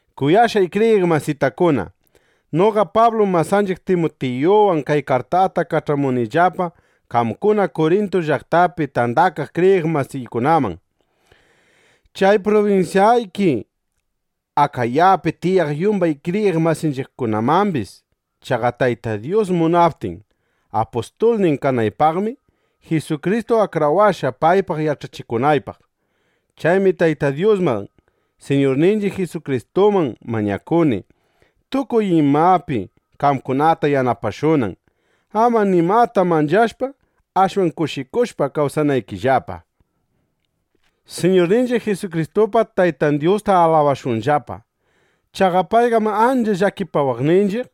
Kuyashqay kriyiq masitakuna, noqa Pablum masanchiq Timutiyuwan kay kartata kach'amunillapa qamkuna Kurintu llaqtapi tandakaq kriyiq masiykunaman, chay prubinsyayki Akayapi tiyaq yumbay kriyiq masinchiqkunamambis. Chaqa Tayta Dyus munaptin apustulnin kanaypaqmi, Jisukristu akrawashqa, paypaq yach'achikunaypaq. Chaymi Tayta Dyusman, Siñurninchiq Jisukristuman mañakuni, tukuy imapi qamkunata yanapashunan, ama nimata manchashpa, ashwan kushikushpa kawsanaykillapa. Siñurninchiq Jisukristupa Taytan Dyusta alabashunllapa. Chaqa payqam ancha llakipawaqninchiq,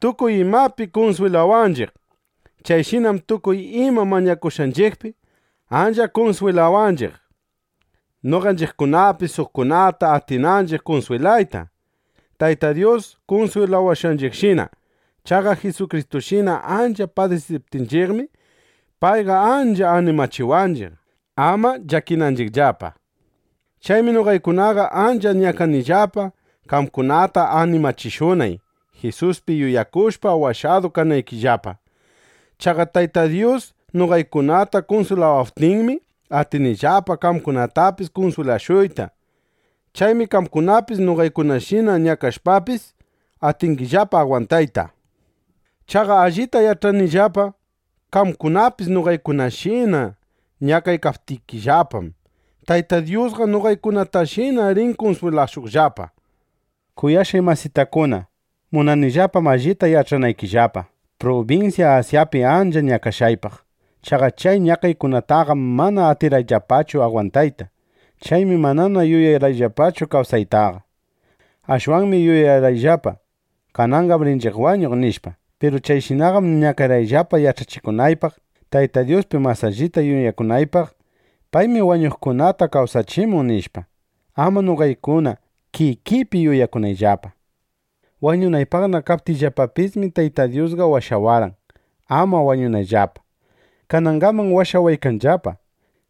tukuy imapi kunswilawanchiq. Chayshinam tukuy ima ñakashqanchiqpi ancha kunswilawanchiq, noqanchiqkunapis suqkunata atinanchiq kunswilayta, Tayta Dyus kunswilawashqanchiqshina. Chaqa Jisukristushina ancha padisiptinchiqmi, payqa ancha animachiwanchiq, ama llakinanchiqllapa. Chaymi noqaykunaqa ancha ñakanillapa, qamkunata animachishunay, Jisuspi yuyakushpa washadu kanaykillapa. Chaqa Tayta Dyus noqaykunata kunswilawaptinmi, atinillapa qamkunatapis kunswilashuyta. Chaymi qamkunapis noqaykunashina ñakashpapis, atingillapa agwantayta. Chaqa allita yach'anillapa: Qamkunapis noqaykunashina ñakaptikillapam, Tayta Dyusqa noqaykunatashina rin kunswilashuqllapa. Kuyashqay masitakuna, munanillapam allita yach'anaykillapa prubinsya Asyapi ancha ñakashqaypaq. Chaqa chay ñakaykunataqam mana atirqayllapachu agwantayta. Chaymi manana yuyarqayllapachu kawsaytaqa. Ashwanmi yuyarqayllapa: Kananqam rinchiq wañuq, nishpa. Piru chayshinaqam ñakarqayllapa yach'akunaypaq, Tayta Dyuspi mas allita yuyakunaypaq: Paymi wañushqakunata kawsachimun, nishpa, ama noqaykuna kikiypi yuyakunayllapa. Wañunaypaqna kaptiyllapapismi, Tayta Dyusqa washawarqan, ama wañunayllapa. Kanangaman washawaykanllapa.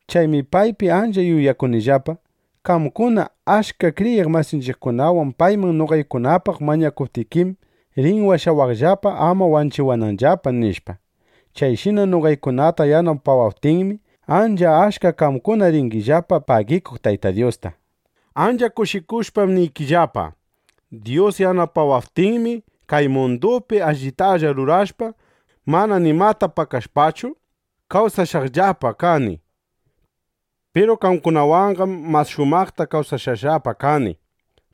Chaymi paypi ancha yuyakunillapa: Qamkuna achka kriyiq masinchiqkunawan payman noqaykunapaq mañakuptikim, rin washawaqllapa, ama wanchiwananllapa, nishpa. Chayshina noqaykunata yanapawaptinmi, ancha achka qamkuna ringillapa pagikuq Tayta Dyusta. Ancha kushikushpam niykillapa: Dyus yanapawaptinmi, kay mundupi allitalla rurashpa, mana nimata pakashpachu, kawsashqallapa kani. Piru qamkunawanqam mas shumaqta kawsashqallapa kani.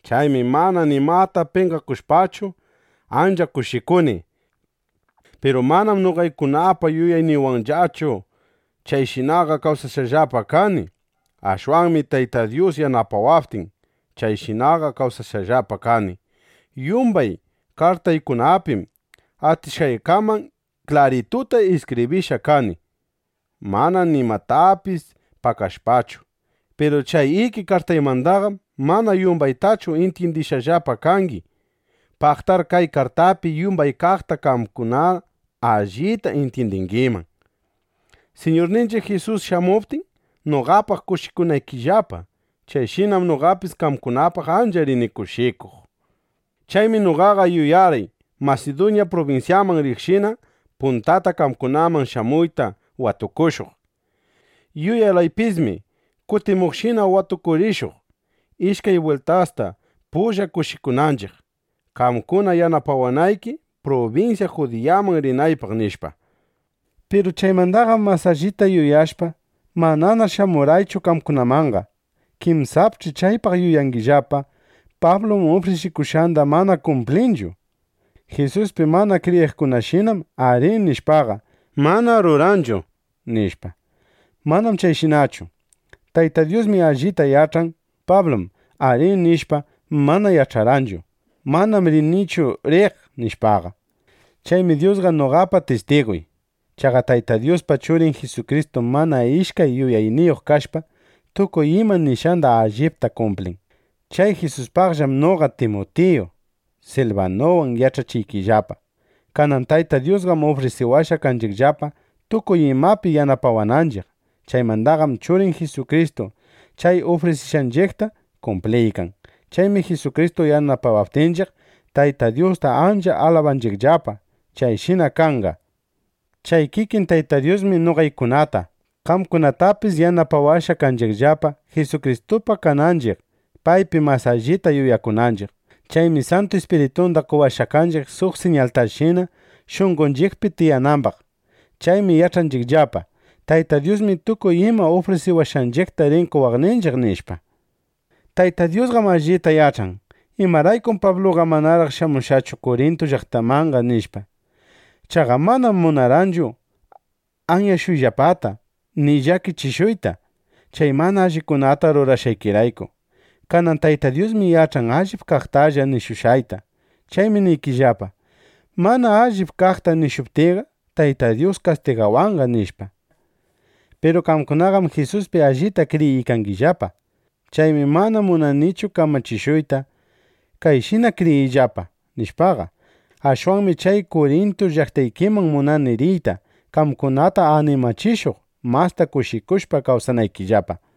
Chaymi mana nimata penqakushpachu, ancha kushikuni. Piru manam noqaykunapa yuyayniywanllachu chayshinaqa kawsashqallapa kani. Ashwanmi Tayta Dyus yanapawaptin, chayshinaqa kawsashqallapa kani. Yumbay kartaykunapim atishqaykaman klarituta iskibrishqa kani, mana nimatapis pakashpachu. Piru chay iki kartaymandaqam mana yumbaytachu intyindishqallapa kangi. Paqtar kay kartapi yumbay kaqta qamkuna allita intyindingiman, Siñurninchiq Jisus shamuptin, noqapaq kushikunaykillapa. Chayshinam noqapis qamkunapaq ancha rini kushikuq. Chaymi noqaqa yuyarqay Masiduña prubinsyaman riqshina puntata qamkunaman shamuyta watukushuq. Yuyarqaypismi kutimuqshina watukurishuq, ishkay bwiltasta pulla kushikunanchiq, qamkuna yanapawanayki, prubinsya Judiyaman rinaypaq, nishpa. Piru chaymandaqam mas allita yuyashpa, manana shamurqaychu qamkunamanqa. Kinsapch'i chaypaq yuyangillapa: Pablum ufrisikushqanda mana kumplinchu. Jisuspi mana kriyiqkunashinam “arí”, nishpaqa, mana ruranchu, nishpa. Manam chayshinachu. Tayta Dyusmi allita yach'an: Pablum “Arí” nishpa, mana yach'arqanchu: Manam rinichu riq, nishpaqa. Chaymi Dyusqa noqapa tistiguy. Chaqa Tayta Dyuspa Churin Jisukristum mana ishkay yuyayniyuq kashpa, tukuy ima nishqanda allipta kumplin. Chay Jisuspaqllam noqa, Timutiyu, Silbanuwan yach'achiykillapa. Kanan Tayta Dyusqam ufrisiwashqa kanchiqllapa, tukuy imapi yanapawananchiq. Chaymandaqam Churin Jisukristu chay ufrisiwashqanchiqta kumpliykan. Chaymi Jisukristu yanapawaptinchiq, Tayta Dyusta ancha alabanchiqllapa: “Chayshina kanqa”, nishpa. Chay kikin Tayta Dyusmi noqaykunata, qamkunatapis yanapawashqa kanchiqllapa, Jisukristupa kananchiq, paypi mas allita yuyakunanchiq. Chaymi Santu Ispiritunda qowashqa kanchiq suq siñaltashina, shunqonchiqpi tiyanambaq. Chaymi yach'anchiqllapa: Tayta Dyusmi tukuy ima ufrisiwashqanchiqta rin qowaqninchiq, nishpa. Tayta Dyusqam allita yach'an: Imaraykum Pabluqa manaraq shamushqachu Kurintu llaqtamanqa, nishpa. Chaqa manam munarqaychu anyashuyllapata ni llakichishuyta chay mana allikunata rurashqaykirayku. Kanan Tayta Dyusmi yach'an allip kaqtalla nishushqayta. Chaymi niykillapa: Mana allip kaqta nishuptiyqa, Tayta Dyus kastigawanqa, nishpa. Piru qamkunaqam Jisuspi allita kriyiykangillapa. Chaymi mana munanichu kamachishuyta: “Kayshina kriyiyllapa”, nishpaqa. Ashwanmi chay Kurintu llaqtaykiman munani riyta, qamkunata animachishuq, masta kushikushpa kawsanaykillapa.